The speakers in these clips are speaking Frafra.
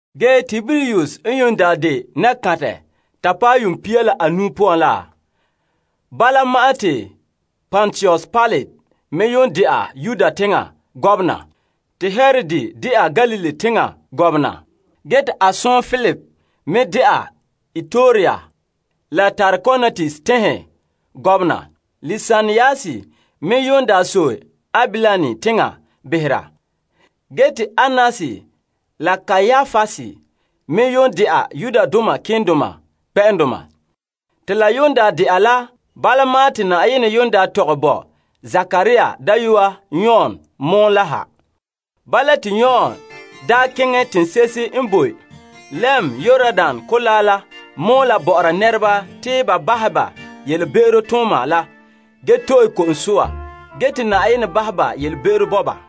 Ge Tiberius n daa de nakantɛ ta paɛ yuun pia la anuu poan la, bala ma'an te Pontius Pilate me de'a Yudea teŋbehera, te Herod de'a Galilee teŋbehera, ge te a sɔɔn Filip me de'a Ituraea la Trakonitis teŋhe nɛŋadaana. Lisanias me n sɔe Abilene teŋa behera, ge te Annas la Kaiapas me dɛna malema nɛŋadoma. Te la de'a la bala ma'an te Na'ayenɛ daa tɔgɛ bo Zekaria dayɔa Yon pɔgɔtia la ha. Bala te Yon daa keŋɛ teŋse'ehe n boe lɛm Yordan Kolaa la mɔɔla bɔ'ɔra nɛreba te ba tee ba potɛn'ɛra ge to'e ko'om soa ge te Na'ayenɛ bahɛ ba yelebe'ero bo ba.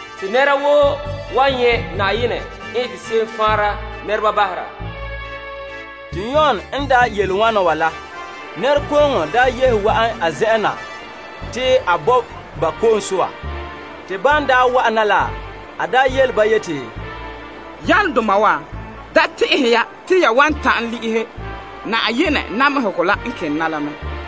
Te nɛra woo nyɛ' Na'ayenɛ faanre la. Te Yon n daa yele wana wa la, nɛrekooŋɔ daa yehe wa'an a zen'en na te a bo ba ko'om soa. Te ban wa'an na la, a yele ba yeti, Bonsɛ'doma kɔma wa, ane n yele ya te ya wan ta'an le'ehɛ namehe seko te Na'ayenɛ yeti a bahɛ te la wa'ana la?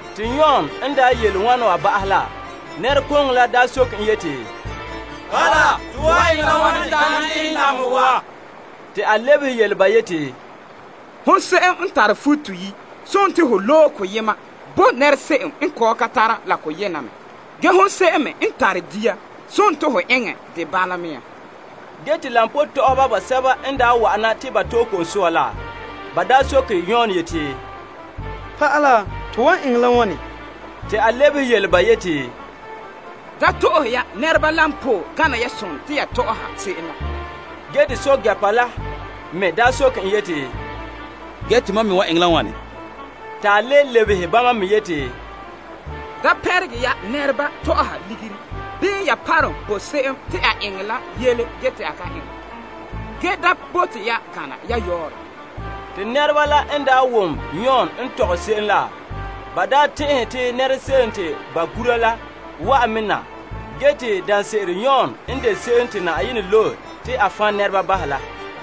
Te Yon n daa yele wana wa ba'ahɛ la, nɛrekooŋɔ la daa soke en yeti, Bala, to wan eŋɛ la wane ta'an le'ehɛ namehegɔ wa? Te a lebehe yele ba yeti, Hon se'em n tare futo toyi' sontii ho loe koyema bo nɛra se'em n kɔ'ɔn ka tare la koyena me. Ge hon se'em me n tare dia sontii ho eŋɛ dɛ bala mea. Ge te koba tɔ'ɔhɔba basɛba n daa wa'ana te ba to'e ko'om soa la, ba soke Yon yeti, Pa'ala to wan eŋɛ la wane? Te a lebehe yele ba yeti, Da to'ohe ya nɛreba koba gana lan sontii ya tɔ'ɔha se'em la. Ge te pɛɛntɛɛnreba me soke en yeti, Ge tomam me wan eŋɛ la wane? Ta le lebehe bama me te, Da pɛnrege ya nɛreba tɔ'ɔha ligiri bii ya parom bo se'em te a eŋɛ yele ge te a ka eŋɛ. Ge da bote ya gana ya yɔɔrɛ. Te nɛreba la n daa wom Yon n tɔgɛ se'em la, ba tɛn'ɛhe te nɛra se'em te ba gura la wa'an me na ge te daanse'ere Yon n de Se'em Te Yenɛ Loe la.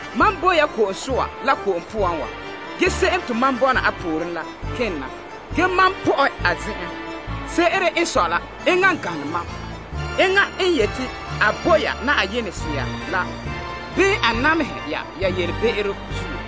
Mam bo ya ko'om soa la ko'om poan wa. Ge se'em te mam bɔna a pooren la kene na. Mam pɔ'ɛ n pirege a tagara. Se'ere n sɔe la, enŋa n gane mam. Enŋa n yete a bo ya Yenɛ Sea la bii a namehe ya ya yelebe'ero zuo.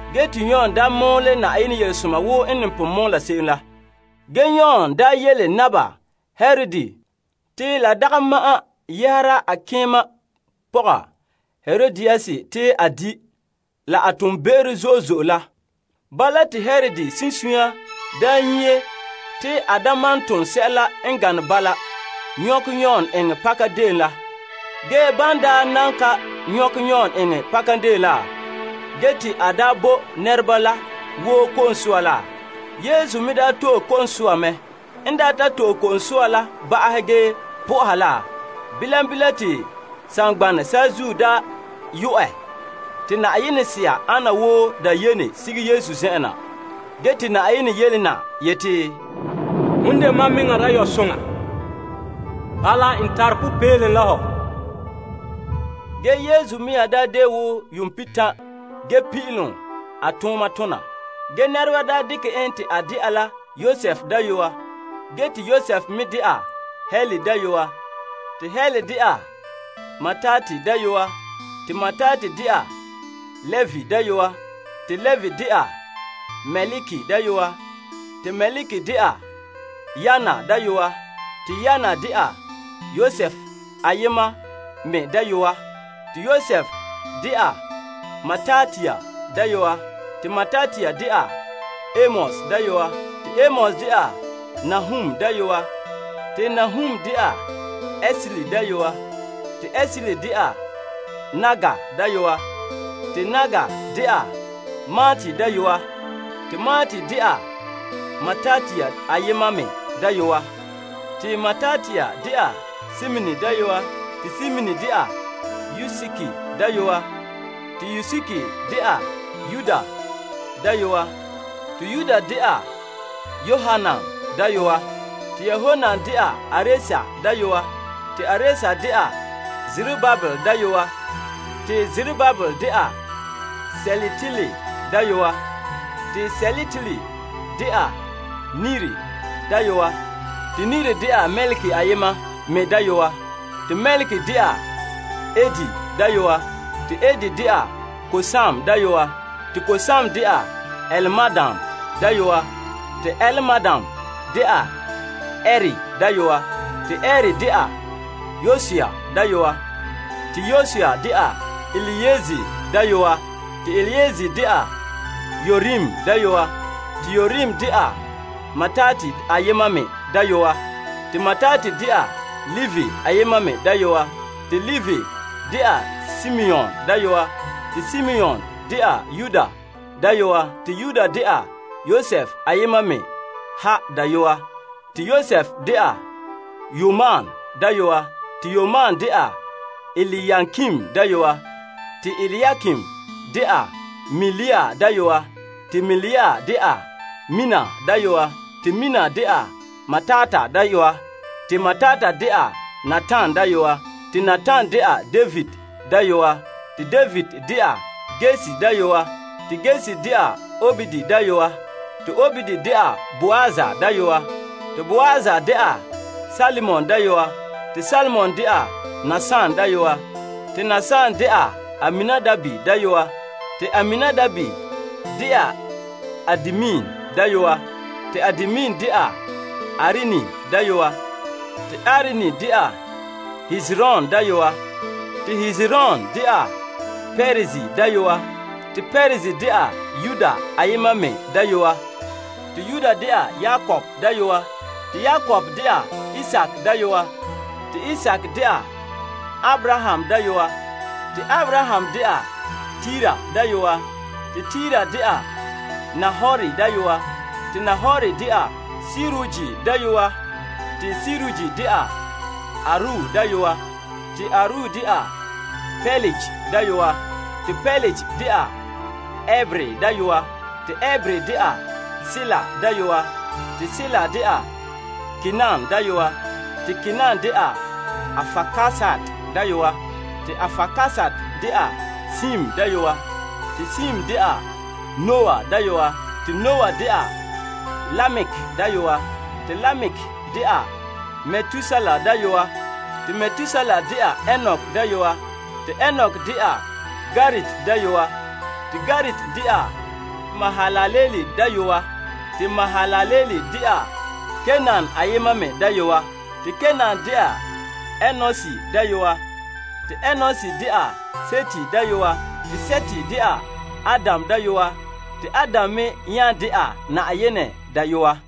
Ge te Yon daa mɔɔlɛ Na'ayenɛ Yelesoma wo n ne pon eta se'em la. Ge Yon yele Naba Herod te la dagɛ ma'an yɛhera a yebega pɔga Herodias te a di', la n tom toonbe'ero zo'e zo'e la. Bala te Herod sunsunya nyie te a malom ton sɛla n gane bala nyɔkɛ Yon eŋɛ pakadeen la. Ge ban daa nan ka nyɔkɛ Yon eŋɛ pakadeen la, ge te a bo nɛreba la woo ko'om soa la, Yesu me to'e ko'om soa mɛ. N ta to'e ko'om soa la ba'ahɛ ge sohɛ Yenɛ, bilam bilam te saŋgbanɛ saazuo daa yo'ɛ te Yenɛ Sea ana wo dayene sige Yesu zen'en na. Te konkore yele na yeti, Hom n de mam dayɔba'arɛ te n nini tegɛ. Bala n tare popeelom la hɔ. Ge Yesu daa de yuun pihitan' ge pin'ilom a tooma tona. Ge nɛreba dekɛ en te a de'a la Yosef dayɔa, ge te Yosef me de'a Heli dayɔa, te Heli de'a Mattat dayɔa, te Mattat de'a Levi dayɔa, te Levi de'a Melki dayɔa, te Melki de'a Yanai dayɔa, te Yanai de'a Yosef ayema me dayɔa, te Yosef de'a Matatias dayɔa, te Matatias de'a Amos dayɔa, te Amos de'a Nahum dayɔa, te Nahum de'a Esli dayɔa, te Esli de'a Nagai dayɔa, te Nagai de'a Maat dayɔa, te Maat de'a Matatias ayema me dayɔa, te Matatias de'a Semein dayɔa, te Semein de'a Yosek dayɔa, te Yosek de'a Yoda dayɔa, te Yoda de'a Yoanan dayɔa, te Yoanan de'a Aresa dayɔa, te Aresa de'a Zerubabel dayɔa, te Zerubabel de'a Sealtiel dayɔa, te Sealtiel de'a Neri dayɔa, te Neri de'a Melki ayema me dayɔa, te Melki de'a Adi dayɔa, te Adi de'a Kosam dayɔa, te Kosam de'a Elmadam dayɔa, te Elmadam de'a Er dayɔa, te Er de'a Yosua dayɔa, te Yosua de'a Eliezer dayɔa, te Eliezer de'a Yorim dayɔa, te Yorim de'a Mattat ayema me dayɔa, te Mattat de'a Levi ayema me dayɔa, te Levi de'a Simeon dayɔa, te Simeon de'a Yuda dayɔa, te Yuda de'a Yosef ayema me ha dayɔa, te Yosef de'a Yonam dayɔa, te Yonam de'a Eliakim dayɔa, te Eliakim de'a Melea dayɔa, te Melea de'a Mena dayɔa, te Mena de'a Matata dayɔa, te Matata de'a Natan dayɔa, te Natan de'a David dayɔa, te David de'a Yesse dayɔa, te Yesse de'a Obed dayɔa, te Obed de'a Boaz dayɔa, te Boaz de'a Salmon dayɔa, te Salmon de'a Nason dayɔa, te Nason de'a Aminadab dayɔa, te Aminadab de'a Admin dayɔa, te Admin de'a Arni dayɔa, te Arni de'a Hezron dayɔa, te Hezron de'a Perez dayɔa, te Perez de'a Yuda ayema me dayɔa, te Yuda de'a Yakob dayɔa, te Yakob de'a Isaak dayɔa, te Isaak de'a Abraham dayɔa, te Abraham de'a Tera dayɔa, te Tera de'a Nahor dayɔa, te Nahor de'a Serug dayɔa, te Serug de'a Areu dayɔa, te Areu de'a Pelege dayɔa, te Pelege de'a Eber dayɔa, te Eber de'a Sela dayɔa, te Sela de'a Kainan dayɔa, te Kainan de'a Arpaksad dayɔa, te Arpaksad de'a Sem dayɔa, te Sem de'a Noah dayɔa, te Noah de'a Lamek dayɔa, te Lamek de'a Metusela dayɔa, te Metusela de'a Enok dayɔa, te Enok de'a Yared dayɔa, te Yared de'a Mahalalel dayɔa, te Mahalalel de'a Kainan ayema me dayɔa, te Kainan de'a Enos dayɔa, te Enos de'a Set dayɔa, te Set de'a Adam dayɔa, te Adam me nya de'a Yenɛ dayɔa.